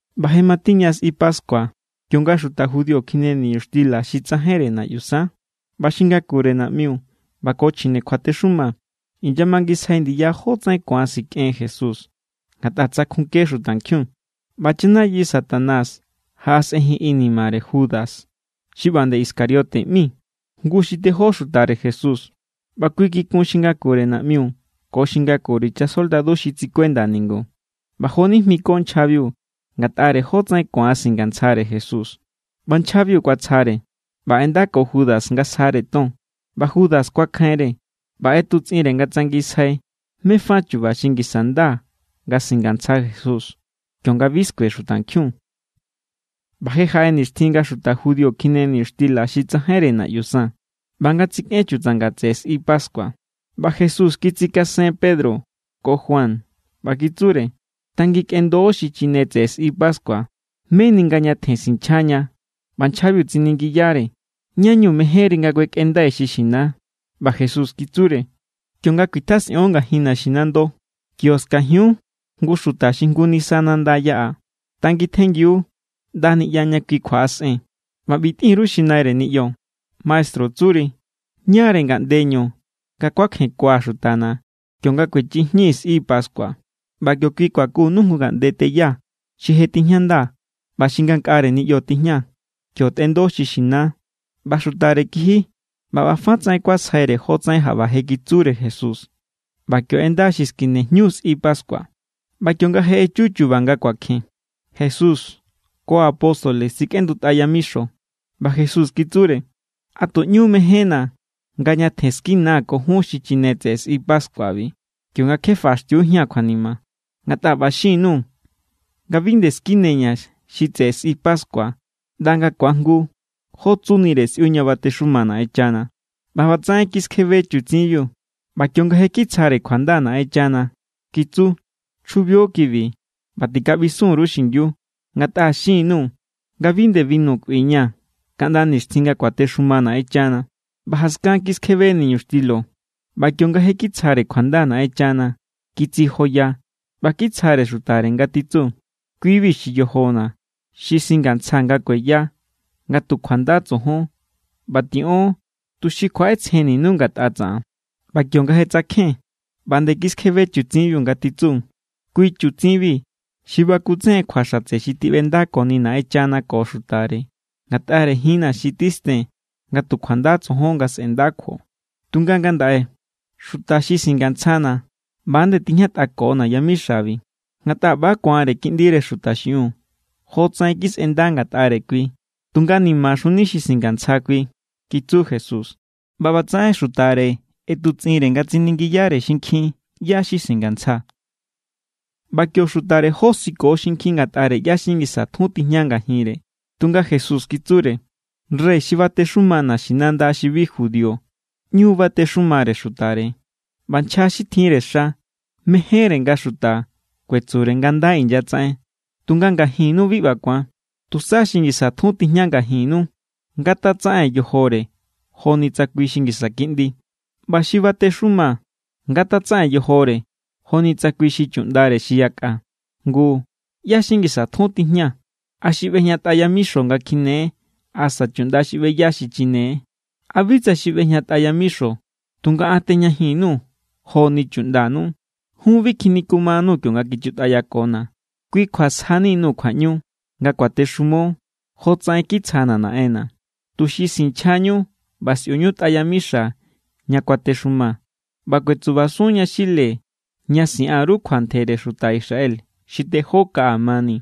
ꞌBa je matiña sꞌi pascua, kionga xuta judío kjine niñuxtila xi tsajainre naꞌyu san. ꞌBa xi ngakure naꞌmiu ꞌba ko chjine kjuatexuma inyamangisjai ndiya jótsaꞌen ku̱an sikꞌen Jesús, ngatꞌa tsakjunke xutankjiun. ꞌBa chanayi Satanás jaꞌasꞌenjin inimare Judas xi ꞌba nde Iscariote ꞌmi, jngu xi tejó xutare Jesús. ꞌBa kui kikun xi ngakure naꞌmiu ko xi ngakure chasoldadu xi tsikuenda ningu, ꞌba jonijmiko nchjabiu ngatꞌare jótsaꞌen ku̱an singantsjare Jesús. ꞌBa nchjabiu kuatsjare ꞌba ꞌendako Judas nga sjare ton. ꞌBa Judas kuakjainre ꞌba ꞌetutsꞌinre nga tsangisjai mé= fa chu̱ba̱ xi ngisa nda nga singantsja Jesús kionga bi skue xutankjiun. ꞌBa je jaꞌe nixtjin nga xuta judío kjine niñuxtila xi tsajainre naꞌyu san, ꞌba nga tsikꞌen chutsanga tseꞌe sꞌi pascua. ꞌBa Jesús kitsikasen Pedro ko Juan, ꞌba kitsure: —Tanginkꞌendo xichine tseꞌe sꞌi pascua, meni nga ñatjen sinchjaña. ꞌBa nchjabiu tsiningiyare: —¿Ña=ñu mejénri nga kuekꞌendai xi xina? ꞌBa Jesús kitsure: —Kionga kuitjasꞌion ngajin naxinando, kio skajiun jngu xuta xi jngu nisa nanda yaꞌa. Tangintjengiu ꞌnda niꞌya ña kui kjuaꞌasꞌen, ꞌba ꞌbi tꞌin_ru xi naire niꞌyo: “Maestru tsuri: ¿Ñáre ngaꞌndeñu nga kuakjenkua̱ xutana̱ kionga kuechji jñii̱ sꞌi pascua?” ꞌBa kio kui kuakunu jngu ngaꞌnde teya xi je tijñanda ꞌba xi ngankꞌare niꞌyo tijña. Kio tꞌendo xi xina. ꞌBa xutare kiji ꞌba ꞌba fa tsaꞌen kuasjaire jotsaꞌen jaꞌba je kitsure Jesús. ꞌBa kio ꞌenda xi skine jñu sꞌi pascua. ꞌBa kionga je echu chu̱ba̱ nga kuakjen, Jesús ko apóstoles tsikꞌendutꞌa yamixo. ꞌBa Jesús kitsure: —¡A tu ꞌñu= mejénna̱ nga ñatjen skinaa̱ ko jun xichine tseꞌe sꞌi pascuabi, kionga kje faꞌaxtiujía̱n kjuanima! Ngatꞌa ꞌba xin_nuu̱ nga bi nde skineña̱ xi tseꞌe sꞌi pascua ꞌnda nga̱ ku̱ajngu jó tsunire sꞌiu ña batexuma Naꞌenchana. ꞌBa ꞌbatsaꞌen kiskjebe chutsinbiu ꞌba kionga je kitsjare kjuanda Naꞌenchana, kitsu: —Chjubio kibi ꞌba tikaꞌbisun_ru xingiu. Ngatꞌa xin_nuu̱ nga bi nde binu kꞌuiña̱ kaꞌnda nixtjin nga kuatexuma Naꞌenchana. ꞌBa jaskan kiskjebe niñuxtilo ꞌba kionga je kitsjare kjuanda Naꞌenchana, kitsijoya ꞌba kitsjare xutare, nga titsu: —Kui=bi xi yojona̱, xi singantsja nga kueya nga tu kjuanda tsojon. ꞌBa tiꞌon, tuxi kjuaꞌetsjenninu ngatꞌa tsaꞌan. ꞌBa kionga je tsakjen, ꞌba nde kiskjebe chutsinbiu, nga titsu: —Kui chutsinbi xi bakutsejen kjua xatse xi tiꞌbendakoni Naꞌenchana ko xutare ngatꞌare jinna̱ xi titsen nga tu kjuanda tsojon nga sꞌe̱nda kjuo. ’Tunga ngandaꞌe, xuta xi singantsjana̱ ꞌba nde tijñatꞌakona̱ yamixabi. Ngatꞌa ꞌba= ku̱anre Kiꞌndire Xuta xiꞌiun jotsaꞌen kisꞌenda ngatꞌare kui, tunga ¡nimaxuni xuta xi singantsja kui! —kitsu Jesús. ꞌBa ꞌbatsaꞌen xutare ꞌetutsꞌinre nga tsiningiyare xinkjin ꞌyá= xi singantsja. ꞌBa kio xutare josiko xinkjin ngatꞌare ꞌyá= xi ngisa tjun tijña ngajinre. Tunga Jesús kitsure: —Rey xi batexuma naxinanda xi bi judío ꞌñu batexumare xutare. ꞌBa nchja xi tjinre xa mejénre nga xuta kuetsure nga nda inyatsaꞌen. Tunga ngajinnu bi ꞌba ku̱an. Tusa xi ngisa tjun tijña ngajinnu ngatatsaꞌen yojore joni tsa kui xi ngisa kiꞌndi. ꞌBa xi batexuma ngatatsaꞌen yojore joni tsa kui xi chuꞌndare xi yakꞌa. Ngu, ¿ꞌyá= xi ngisa tjun tijña? ¿A xi ꞌbejñatꞌa yamixo nga kjine=, asa chuꞌnda xi ꞌbeya xichine=? ¿A bi tsa xi ꞌbejñatꞌa yamixo? Tunga an tejñajin_nuu̱ joni chuꞌndanu. ’Jun bi kjinikumanuu̱ kionga kichutꞌayakona̱. Kui kjua sjani_nuu̱ kjuaꞌñu nga kuatexumo, jotsaꞌen kitsjana̱ Naꞌenna̱, tuxi sinchjañu ꞌba sꞌiuñu tꞌa yamixana̱ ña kuatexumaa̱, ꞌba kuetsubasun yaxile ña siꞌan_ru kjua ntjere xuta Israel xi tejó kaꞌa mani.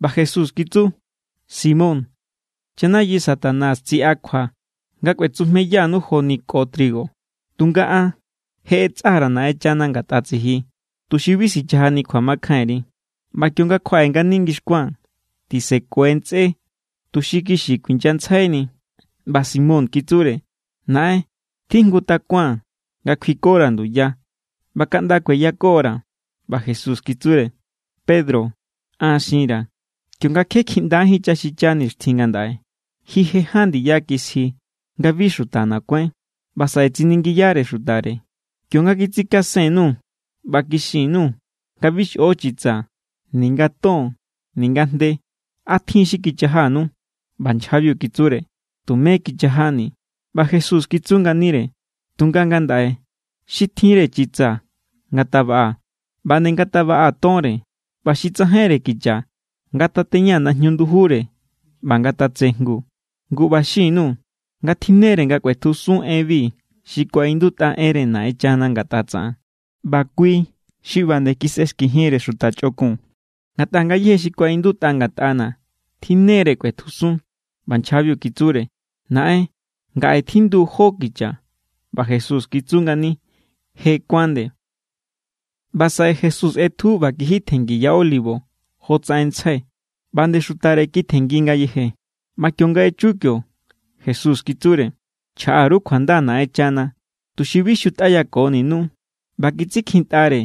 ꞌBa Jesús kitsu: —Simón, chanayi Satanás tsiꞌakjua nga kꞌuetsujmeyanu joni ko trigo. Tunga an je ꞌetsa_ra̱ Naꞌenchana ngatꞌa tsiji, tuxi bi sichajani kjuamakjainri. ꞌBa kionga kjuaꞌe ngani ngixkua̱n, tisekue ntsꞌé tuxi kixi kuinyantsjaini. ꞌBa Simón kitsure: —Naꞌen, tjijngu takua̱n nga kjuikora̱ nduya ꞌba kaꞌnda kueyakora̱. ꞌBa Jesús kitsure: —Pedro, an xinra̱, kionga kje kjiꞌndajín chaxicha nixtjin ngandaꞌe, ji je ján ndiya kisji nga bi xutana̱ kuáin. ꞌBa saꞌe tsiningiyare xutare: —Kionga kitsikasen_nuu̱ ꞌba kixin_nuu̱ nga bi xꞌo chitsa, ninga ton ninga jnde, ¿a tjin= xi kichajanu? ꞌBa nchjabiu kitsure: —Tumé kichajani̱. ꞌBa Jesús kitsu nganire: —Tunga ngandaꞌe, xi tjinre chitsa, ngatabaꞌa. ꞌBa nde ngatabaꞌa tonre. ꞌBa xi tsajainre kicha, ngatateña najñu ndujure ꞌba ngatatsejngu. Ngu ꞌba xin_nuu̱, nga tjinnere nga kꞌuetjusun enbi xi kuaꞌindutꞌa enre Naꞌenchana ngatꞌa tsaꞌan: “ꞌBa kui xi ꞌba nde kisꞌexkijinre xuta chꞌokun.” Ngatꞌa ngayéje xi kuaꞌindutꞌa ngatꞌana̱ tjinnere nga kꞌuetjusun. ꞌBa nchjabiu kitsure: —¡Naꞌen, ngaꞌe tjindu jó kicha! ꞌBa Jesús kitsu ngani: —Je kuán nde. ꞌBa saꞌe Jesús ꞌetju ꞌba kiji tjenngi Ya Olivo jotsaꞌen ntsjai. ꞌBa nde xutare kitjenngi ngayeje. ꞌBa kionga je echu kio, Jesús kitsure: —Chjaꞌa_ru kjuanda Naꞌenchana, tuxi bi xutꞌayakoninú. ꞌBa kitsikjintꞌare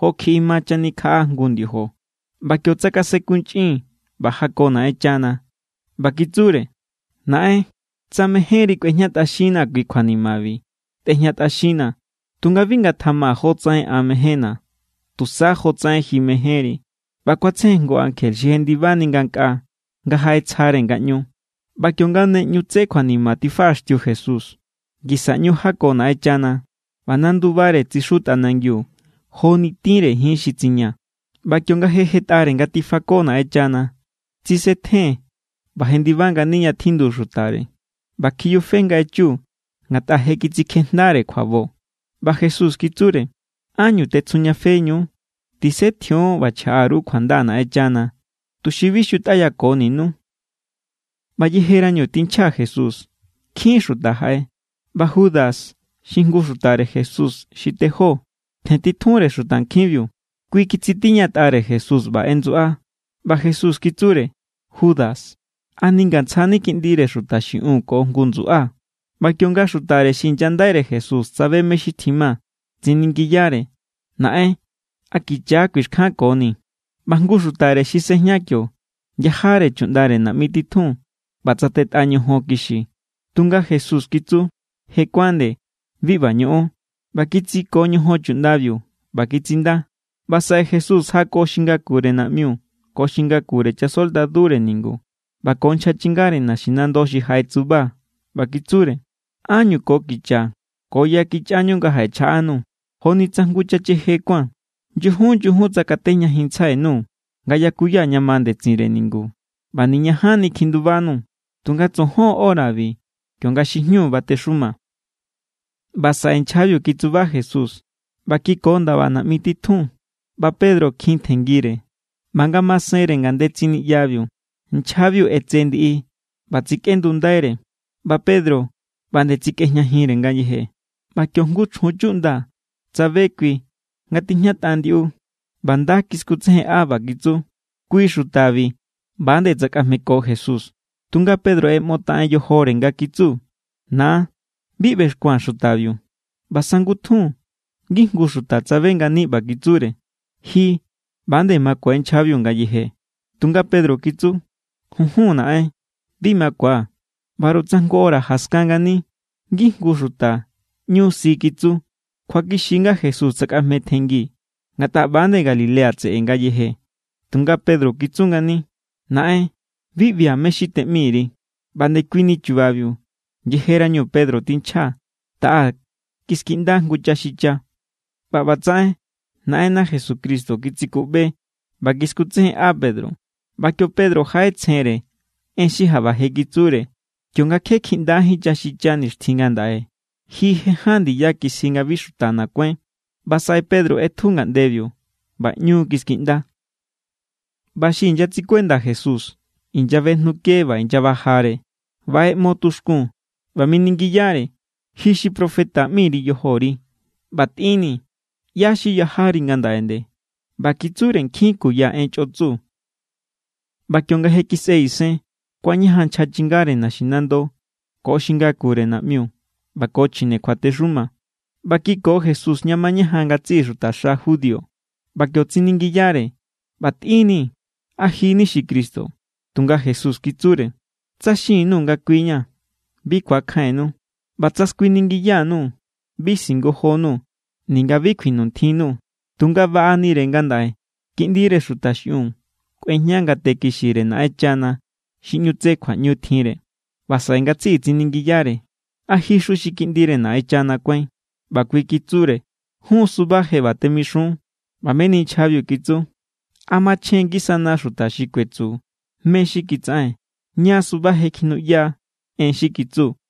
jo kjiꞌi ma chanikjaꞌa jngu ndiojo. ꞌBa kio tsakasenkunchꞌin ꞌba jako Naꞌenchana, ꞌba kitsure: —Naꞌen, tsa mejénri kꞌuejñatꞌaxinnaa̱ kui kjuanimabi, tꞌejñatꞌaxinnaa̱. Tunga bi ngatjama jotsaꞌen an mejénna̱, tusa jotsaꞌen ji mejénri. ꞌBa kuatsejen jngu ankje xi jendibajenni ngankꞌaa nga jaꞌetsjare ngaꞌñu. ꞌBa kionga ne tse kjuanima tifaꞌaxtiu Jesús, ngisa ꞌñu jako Naꞌenchana, ꞌba nandubare tsixu tꞌanangiu joni tinre jin xi tsiña. ꞌBa kionga je jetꞌare nga tifako Naꞌenchana, tsisetjen ꞌba jendiba ngani ña tjindu xutare. ꞌBa kjiyufe nga echu ngatꞌa je kitsikjejndare kjuabo. ꞌBa Jesús kitsure: —¿Ánñu tetsjujñafeñu? Tisetjion ꞌba chjaꞌa_ru kjuanda Naꞌenchana, tuxi bi xutꞌayakoninú. ꞌBa yejerañu tinchja Jesús, nkjin xuta jaꞌe. ꞌBa Judas xi jngu xutare Jesús xi tejó tjentitjunre xutankjinbiu. Kui kitsitiñatꞌare Jesús ꞌba ꞌendsuꞌa. ꞌBa Jesús kitsure: —Judas, ¿a ningantsjani Kiꞌndire Xuta xiꞌiun ko jngu ndsuꞌa? ꞌBa kionga xutare xi inyandaire Jesús tsabe mé= xi tjima, tsiningiyare: —Naꞌen, ¿a kicha= kuixkjankoni̱? ꞌBa jngu xutare xi sꞌejña kio yajare chuꞌndare naꞌmi titjun, ꞌba tsatetꞌa ñojon kixi. Tunga Jesús kitsu: —Je kuán nde. Bi ꞌba ñoꞌon. ꞌBa kitsiko ñojon chuꞌndabiu, ꞌba kitsinda. ꞌBa saꞌe Jesús jako xi ngakure naꞌmiu ko xi ngakure chasoldadure ningu ꞌba ko nchja chingare naxinando xi jaꞌetsuba, ꞌba kitsure: —¿Ánñu ko kicha ko ya kichꞌañu nga jaꞌechjaꞌanuu̱, joni tsa jngu chacheje kuáa̱n? Nyujun nyujun tsakatejñajinntsjai_nuu̱ nga yakuya ña ma ndetsinre ningu, ꞌba niñajanni kjindubanuu̱. Tunga tsojon horabi, kionga xi jñu batexuma. ꞌBa saꞌe nchjabiu kitsuba Jesús ꞌba kiko ndaba naꞌmi titjun. ꞌBa Pedro kjin tjenngire. ꞌBa ngamasenre ngandetsin niꞌyabiu nchjabiu ꞌetse ndiꞌi ꞌba tsikꞌendundaire, ꞌba Pedro ꞌba nde tsikꞌejñajinre ngayeje. ꞌBa kio jngu chjun chuꞌnda tsabe kui nga tijñatꞌa ndiꞌu, ꞌba nda kiskutsejenꞌa, ꞌba kitsu: —Kui xutabi ꞌba=nde tsakꞌajmeko Jesús. Tunga Pedro ꞌeꞌmotaꞌen yojore nga kitsu: —Na, bi ꞌbexkua̱n xutabiu. ꞌBa sangutjun, ngijngu xuta tsabe ngani, ꞌba kitsure: —Ji ꞌba=nde makue nchjabiu ngayeje. Tunga Pedro kitsu: —Junjun, naꞌen, bi makua̱. ꞌBaru tsa jngu hora jaskan ngani, ngijngu xuta ꞌñu si kitsu: —Kjuakixi= nga Jesús tsakꞌajmetjenngi, ngatꞌa ꞌba=nde Galilea tseꞌe ngayeje. Tunga Pedro kitsu ngani: —Naꞌen, bi ꞌbia̱ mé= xi teꞌmi_ri. ꞌBa ndekuini chubabiu, yejerañu Pedro tinchja, taꞌa kiskiꞌnda jngu chaxicha. ꞌBa ꞌbatsaꞌen Naꞌenna Jesucristo kitsikuꞌbe ꞌba kiskutsejenꞌa Pedro, ꞌba kio Pedro jaꞌetsjenre en xi jaꞌba je kitsure: “Kionga kje kjiꞌndajín chaxicha nixtjin ngandaꞌe, ji je ján ndiya kisji nga bi xutana̱ kuáin.” ꞌBa saꞌe Pedro ꞌetju ngaꞌndebiu, ꞌba ꞌñu kiskiꞌnda. ꞌBa xi inyatsikuenda Jesús inyabejnuke ꞌba inyabajare. ꞌBa ꞌeꞌmo tuxkun, ꞌba miningiyare: —Ji xi profeta ꞌmi_ri yojori, ꞌba tꞌinnii̱, ¿ꞌyá= xi yajari ngandaꞌe nde? ꞌBa kitsure nkjin kuya en chꞌotsu. ꞌBa kionga je kisꞌe isen, kuañajan nchja chingare naxinando ko xi ngakure naꞌmiu ꞌba ko chjine kjuatexuma, ꞌba kiko Jesús ña mañajan ngatsiꞌi xutaxa judío. ꞌBa kio tsiningiyare: —ꞌBa tꞌinnii̱, ¿a ji= ni xi Cristo? Tunga Jesús kitsure: —Tsa xin_nuu̱ nga kui= ña̱, bi ku̱akjainnu. ꞌBa tsa skuiningiya_nuu̱, bi singojonuu̱ ninga bi kjuinuntjinnuu̱. Tunga baꞌanire ngandaꞌe Kiꞌndire Xuta xiꞌiun kꞌuejña ngate kixire Naꞌenchana xi ꞌñu tse kjuaꞌñu tjinre. ꞌBa saꞌe ngatsiꞌi tsiningiyare: —¿A jixu xi Kiꞌndire Naꞌenchana kuáin? ꞌBa kui kitsure: —Jún= suba je ꞌba temixun. ꞌBa meni nchjabiu kitsu: —¿A machjen ngisana xuta xi kuetsu mé= xi kitsaꞌen? Ña= suba je kjinuꞌya en xi kitsu.